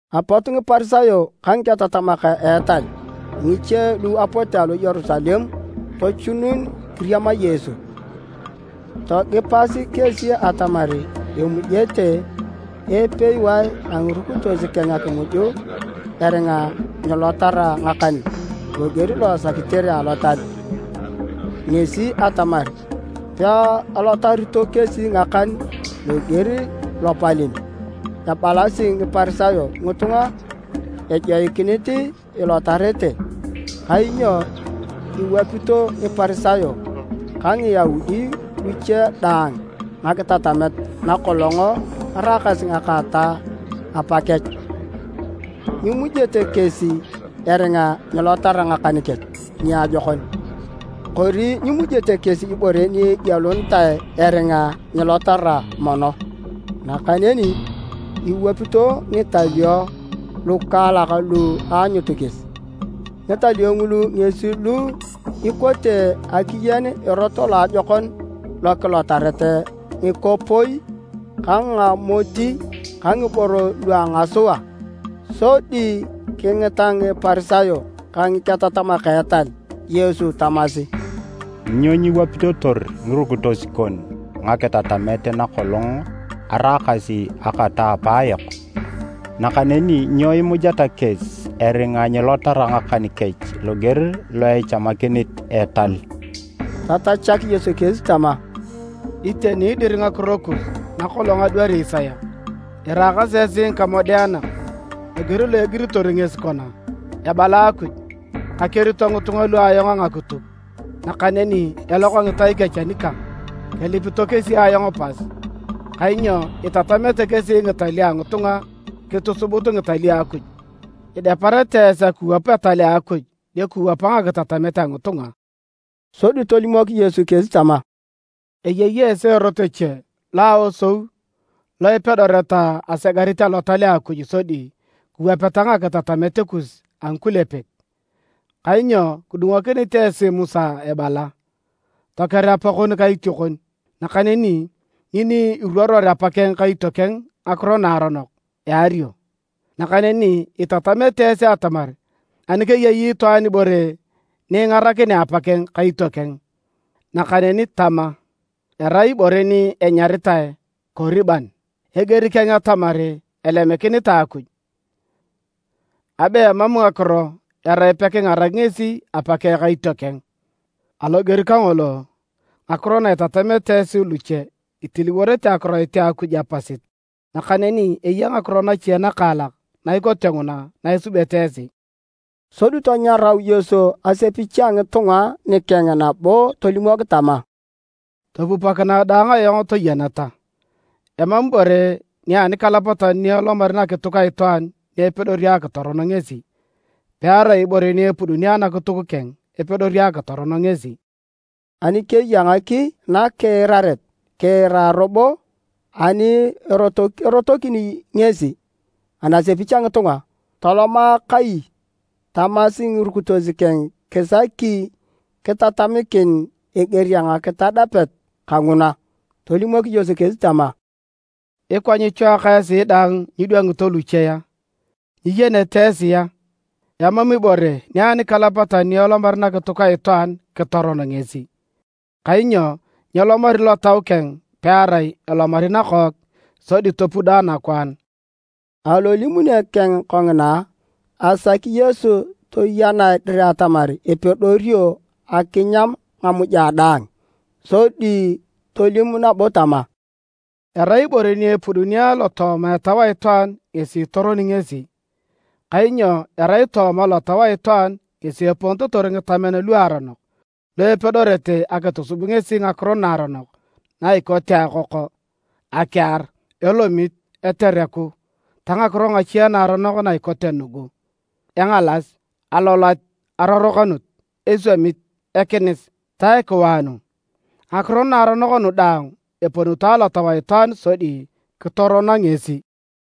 Apot Ngiparisayo ka ngiketatamak a etal ngiche lu apote alo Yerusalem tochunun kiriama Yesu. Togipasi kesi atamar emujete epewae a ngirukitos keng akimuj eringa nyilotara ngakan loger lo esakitere alotal, ngesi atamar, peelotarito kesi ngakan loger lopalem ebalasi Ngiparisayo ngitunga ejoikinit ilotarete. Kainyo iwapito Ngiparisayo ka Ngiyaudi luche daang ngakitatamet nakolong eraakasi ngaka ta apakech. Nyimujete kesi eringa nyilotara ngakan kech niajokon. Kori nyimujete kesi ibore ni egielunitae eringa nyilotara mono. Nakaneni iwapito ngitalio lukaalak lu aanyut kesi. Ngitalio ngulu ngesi lu ikote akiyen erot loajokon lokilotaret ngikopoi ka ngamoti ka ngiboro lua ngasua. Sodi kingita Ngiparisayo ka Ngiketatamak a etal Yesu tamasi, “Nyo nyiwapitotor ngirukitos kon ngakitatamet nakolong araakasi ngaka ta apaayok? Nakaneni nyo imujeta kesi eringa nyilotara ngakan kech loger lo echamakinit etal?” Tatachak Yesu kesi tama, “Iteni dir ngakiro kus nakolong adwari Isaya! Iraakasi esi ngikamodeanak loger lo egiritor ngesi kona: ‘Ebala Akuj, kakerito ngitunga lu ayong a ngakituk, nakaneni eloka ngitai kech anikang. Kelipito kesi ayong pas, kainyo itatamete kesi ngitalio a ngitunga kitusubut ngitalio a Akuj!’ “Ideparete esi akiwap etal a Akuj dio kiwapa ngakitatamet a ngitunga.” Sodi tolimok Yesu kesi tama, “Eyei esi erot eche lo a aosou lo ipedoreta asegarit Alotal a Akuj sodi kiwapeta ngakitatamet kus a ngikulepek. Kainyo kidungokinit esi Musa ebala, ‘Toker apakon ka itiokon,’ nakaneni, ‘Ngini iruoror apakeng ka itiokeng ngakiro naaronok, eario.’ Nakaneni itatamete esi atamar ani keyei itwaan ibore ni ingarakinea apakeng ka itiokeng, nakaneni tama, ‘Erai ibore ni enyaritae Koriban’ (eger keng atamar elemikinitae Akuj,) abe emam ngakiro erai pekingarak ngesi apakeng ka itiokeng. Aloger kangolo, ngakiro na itatamete esi luche itiliworete Akiroit a Akuj apasit. Nakaneni eya ngakiro nache nakaalak na ikote nguna na isubete esi.” Sodi tanyarau Yesu asepich a ngitunga nikeng nabo tolimok tama, “Topupokinae daang ayong toyeneta. Emam ibore nia anikalapatan ni elomari nakituk a itwaan ni epedori akitoron ngesi. Pearai ibore ni epuduni anakituk keng epedori akitoron ngesi.” [ Ani keya ngaki nakiiraret, kiira robo!] Ani erotokini ngesi anasepich a ngitunga toloma kai, tamasi ngirukitos keng kisaki kitatamikin eger a ngakitadapet kanguna. Tolimok Yesu kesi tama, “Ikwa nyichwaaka esi dang nyidwangito luche a? Nyiyenete esi a? Emam ibore nia anikalapatan ni elomari nakituk a itwaan kitoron ngesi, kainyo nyelomari lotau keng pearai elomari nakook sodi topudo anakwaan.” (Alolimune keng kongina, asaki Yesu toyenae dir atamar epedorio akinyam ngamuja daang.) Sodi tolim nabo tama, “Erai ibore ni epuduni alotooma etau a itwaan ngesi itoroni ngesi. Kainyo erai tooma lotau a itwaan ngesi eponitotor ngitamen luaronok lu epedorete akitusub ngesi ngakiro naaronok na ikote akoko, akiar, elomit, etereku ta ngakiro nache naaronok na ikote nugu, engalas, aloloat, arorokanut, eswamit, ekinis ta ekiwaanu, ngakiro naaronok nu daang eponito alotau a itwaan sodi kitorono ngesi.”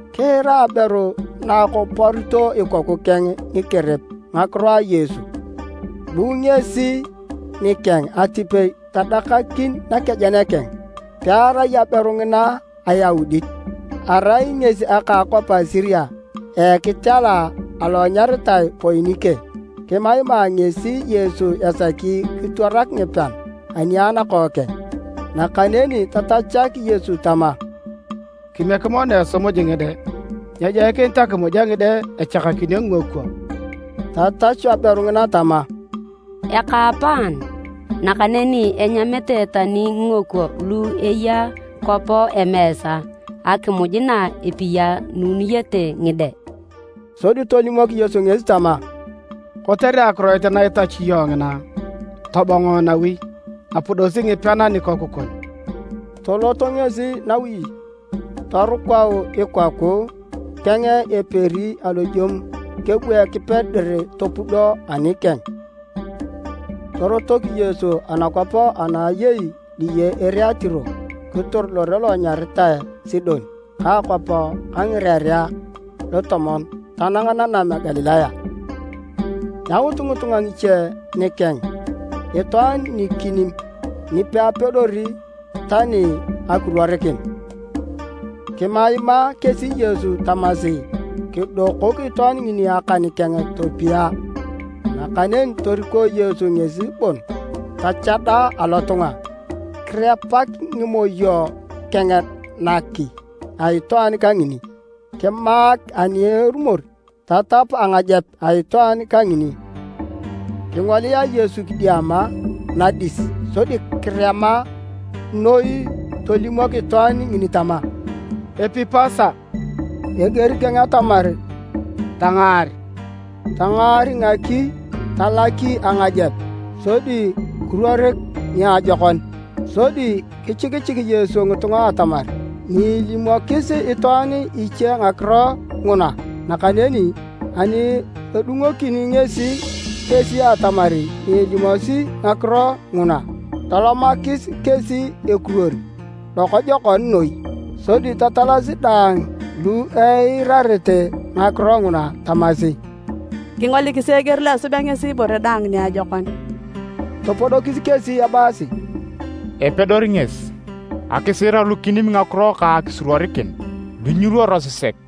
Kiira aberu na akoporito ikoku keng ngikerep ngakiro a Yesu. Bu ngesi nikeng atipei tadakakin nakejen keng. Pearai aberu ngina Ayaudit. Arai ngesi aka a akwap a Siria a ekitela alo enyaritae Poinike. Kimaima ngesi Yesu esaki kitwarak ngipean ani a nakookeng. Nakaneni tatachak Yesu tama, “Kimiek mono esimuj ngide. Nyejoikinit akimuj a ngide echakakinio ngingokwo.” Tatachu aberu ngina tama, “Ekaapaan, nakaneni enyamete tani ngingokwo lu eya kwap emeesa akimuj na epiyanunete ngide!” Sodi tolimok Yesu ngesi tama, “Kotere akiroit na itachu iyong ngina, tobongo nawi. Apudosi ngipean anikoku kon!” Tolot ngesi nawi torukau ikoku keng eperi alojemu. Kebu Ekipe dir topudo anikeng. Torotok Yesu anakwap ana ayei diye ere a Tiro kitor lore lo enyaritae Sidon ka akwap a Ngirerea a Lutomon tanang nanam a Galilaya. Yaut ngitunga ngiche nikeng itwaan nikinim ni peapedori tani akiruorikin. Kimaimaa kesi Yesu tamasi kidokok itwaan ngini akan keng topia. Nakaneni toriko Yesu ngesi bon tachada alotunga. Kirepak ngimoyo keng naki a itwaan kangini. Kimaak ani erumor tatap angajep a itwaan kangini. Kingolia Yesu kidiama nadis sodi kirema noi tolimok itwaan ngini tama, “Epipasa,” eger keng atamar, “Tangaar!” Tangaar ngaki, talaki angajep, sodi kiruorik niajokon. Sodi kichikichik Yesu ngitunga atamar nyeelimokis itwaan iche ngakiro nguna, nakaneni ani edungokini ngesi kesi atamar nyeelimosi ngakiro nguna, tolomakis kesi ekiruor lokojokon noi. Sodi tatalasi daang lu eirarete ngakiro nguna tamasi, “Kingolikisi eger lo esubea ngesi ibore daang niajokon!” Topodokis kesi ebaasi, “Epedori ngesi akisiirar lukinim ngakiro ka akisuruorikin lu nyiruorosi sek!”